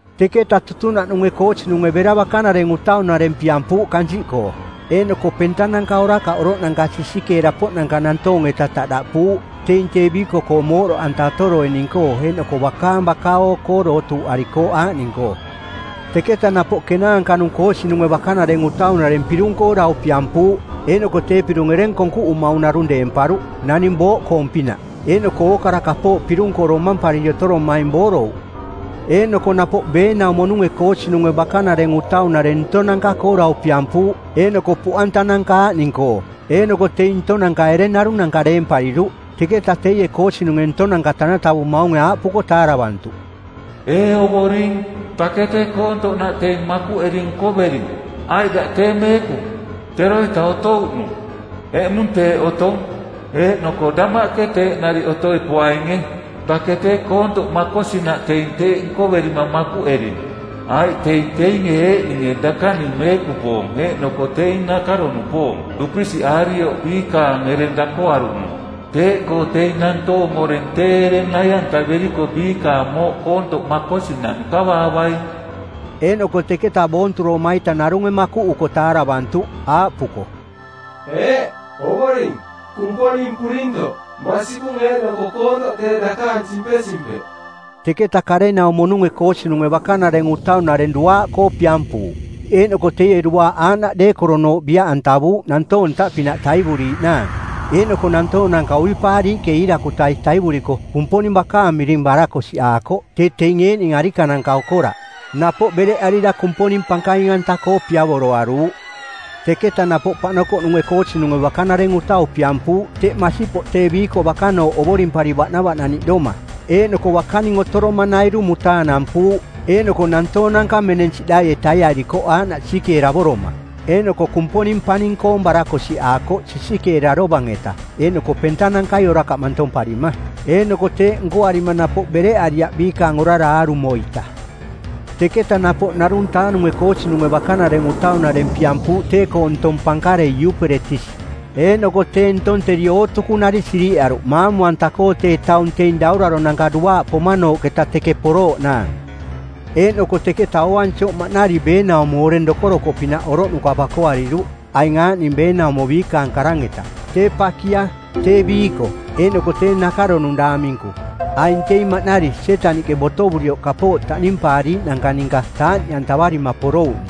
Teketa tutunaꞌnunge koosinunge bera bakanareng utaunareng piampuuꞌ kansiꞌkoo, eeꞌnoko pentananka orakaꞌ oroꞌnanka sisikeera-poꞌnanka nantoong-eta taꞌdaꞌpuuꞌ, teing tee biiko-koong mooꞌdoꞌanta otoroining-koo eeꞌnoko bakaang baka-oo-koo dootuuꞌarikooꞌ aaꞌning-koo. Teketa napoꞌ kenaanka-nung koosinunge bakanareng utaunareng pirung-koo dau piampuuꞌ, eeꞌnoko tee pirung ereng koonkuꞌumaung narung deemparuꞌ naning booꞌkoong-pinaꞌ, eeꞌnoko ookara kapooꞌ pirung-koo domampariri otoromaing boorouꞌ. Eeꞌnoko napoꞌ beenaumo-nunge koosinunge bakanareng utaunareng ntonanka-koo dau piampuuꞌ eeꞌnoko puꞌantananka aaꞌning-koo, eeꞌnoko teing ntonanka ereng narunanka deempariruꞌ. Teketa teie koosinunge ntonanka tanatavumaunge aaꞌpuko taaravantuꞌ, “Ee Ovoring, dake tee koontoꞌnaꞌ teing makuꞌeri nkovering. Aiꞌ daꞌ tee Meekung, teroita otouꞌnung, eꞌmung teeꞌ otong, eeꞌnoko damaꞌke teeꞌ nariꞌ otoi poainge. Dake tee koontoꞌ makosinaꞌ teing teeꞌ nkoverima makuꞌering. Aiꞌ teing teinge eeꞌninge dakaning meekupoong eeꞌnoko teing nakaro-nupoong˜ dupisiꞌaarioꞌ biikaang ereng dakoaruꞌnung. Teeꞌkoo teing nantoong oreng tee ereng nai-antaveriko biikaang mooꞌ koontoꞌ makosinaꞌ nkavaavaing.” Eeꞌnoko teketa boonturoma-ita narunge makuꞌuko taaravantuꞌ, aaꞌpuko, “Eeꞌ, Ovoring, Kumponing Purintoꞌ, masikung eeꞌnoko koontoꞌ tee dakaang simpesimpeꞌ.” Teketa karenaumo-nunge koosinunge bakanareng utaunareng duaaꞌkoo piampuuꞌ, eeꞌnoko teie duaaꞌ aaꞌnaꞌ deekoronooꞌ biaꞌantavuuꞌ nantoong ntaꞌpinaꞌ taivuriiꞌnaang. Eeꞌnoko nantoonanka uipaariiꞌke iirakutai taivuriko Kumponing bakaang miring barakosiꞌaakoꞌ tee teing eeꞌning arikananka okoraꞌ, napoꞌ bereꞌarira Kumponing pankaing-anta-koo piavoroaruuꞌ. Teketa napoꞌ paꞌnokoꞌnunge koosinunge bakanareng utau piampuuꞌ teꞌ masipoꞌ tee biiko bakanooꞌ ovorimpari baꞌnavaꞌnaniꞌdoma, eeꞌnoko bakaning otoromanairu mutaanampuuꞌ eeꞌnoko nantoonanka meneng siꞌdaie taiarikoꞌ aaꞌnaꞌ sisikeeravoroma. Eeꞌnoko Kumponing paning-koong barakosiꞌaakoꞌ sisikeera dovang-eta eeꞌnoko pentanankai orakaꞌ mantomparima. Eeꞌnoko teeꞌ nkoarima napoꞌ bereꞌariaꞌ biikaang orara aarumo-ita. Teketa napoꞌ ˜narung-taa-nunge koosinunge bakanareng utaunareng piampuuꞌ tee-koo ntong pankarei Iuperetisi eeꞌnoko tee ntong teri ootukunari siriꞌaruꞌ maamu-anta-koo tee taung teing dauraronanka duaaꞌ poma-nooꞌketa teke porooꞌnaang. Eeꞌnoko teketa ooansioꞌ maꞌnari beenaumo oreng dokorokoꞌpinaꞌ oroꞌnuka bakoariruꞌ aing aaꞌning beenaumo biikaang karang-eta: tee pakia, tee biiko, eeꞌnoko tee nakaronung daang minku. Aing teing maꞌnari Sietaniꞌke botovurioꞌ kapooꞌ taꞌnimpaariiꞌnanka ninka taaꞌniꞌantavarima porouꞌning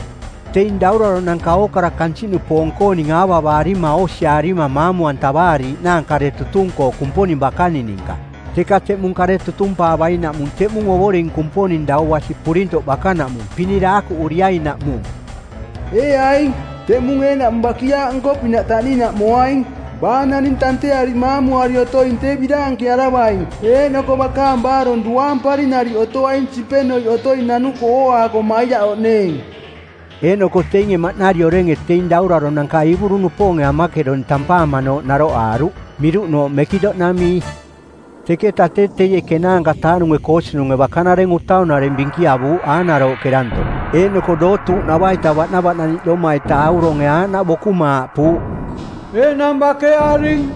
teing dauraronanka ookara kansiꞌnupoong-kooning aavavaarima oosiaarima maamu-antavaariiꞌnaang kare tutung-koo Kumponing bakaning ninka, teka teꞌmung kare tutumpaavainaꞌmung teꞌmung Ovoring Kumponing Dau Basi Purintoꞌ bakanaꞌmung pinidaakuꞌuriainaꞌmung. “Ee aing, teꞌmung eeꞌnaꞌmung bakiaaꞌnko-pinaꞌ taꞌninaꞌ moaing. Baa naning tanteari maamuari otoing tee biraankearavaing eeꞌnoko bakaang baarong duaampari nariꞌ otoaing simpenoiꞌ otoi nanuko ooaako maiaꞌoꞌneeng.” Eeꞌnoko teinge maꞌnari orenge teing dauraronanka Iiburu-nupoonge Amakedon tampaamanooꞌ naroꞌaaruꞌ, miruꞌnooꞌ Mekido-namii. Teketa tee teie ˜kenaanka-taa-nunge koosinunge bakanareng utaunareng bikiavuuꞌ aanarooꞌke danto, eeꞌnoko dootuuꞌnava-ita baꞌnavaꞌnaniꞌdoma-ita auronge aaꞌnaꞌ bokuma aaꞌpuuꞌ, “Enang bakearing.”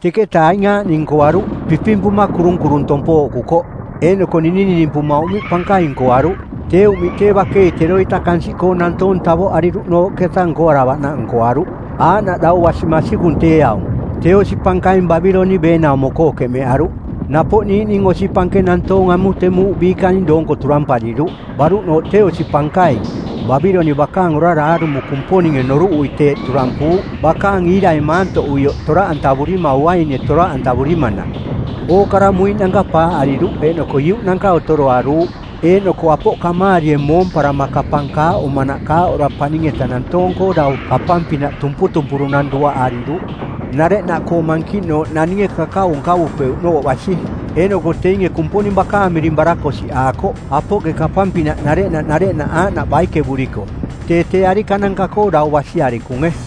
Teketa aing aaꞌning nkoaruꞌ: pipimpuma kurunkurung tompooꞌkukoꞌ, eeꞌnoko ninininimpuma uꞌmiꞌ pankaing nkoaruꞌ, tee uꞌmiꞌ tee bakei teroita kansiꞌkoo nantoong tavoꞌariruꞌnooꞌketa nkoaravaꞌnaꞌ nkoaruꞌ, aaꞌnaꞌ dau basi masikung tee aung. Tee osi pankaing Babiloniꞌ beenaumo-koo keꞌmeꞌaruꞌ. Napoꞌ niiꞌning osi pankeng nantoong amutemuuꞌ biikaning doonko turampariruꞌ. Baruꞌnooꞌ tee osi pankaing, Babiloniꞌ bakaang orara aarumo Kumponinge noruꞌui teeꞌ turampuuꞌ bakaang iirai maantoꞌuioꞌ toraꞌantavurima uainie toraꞌantavurimanaꞌ. Ookara muiꞌnanka paaꞌariruꞌ eeꞌnoko iuꞌnanka otoroaruuꞌ. Eeꞌnoko apoꞌ kamaarie moomparama kapang kaaꞌomanaꞌ kaaꞌora paning-eta nantoong-koo dau kapang-pinaꞌ tumputumpurunang duaꞌariruꞌ, nareꞌnaꞌkoo mankiꞌnooꞌ naninge kakau nkavupeuꞌnooꞌ basi. Eeꞌnoko teinge Kumponing bakaang miring barakosiꞌaakoꞌ apoꞌke kapang-pinaꞌ nareꞌnaꞌ nareꞌnaꞌ aaꞌnaꞌ baikevuriko, tee tee arikananka-koo dau basi arikunge.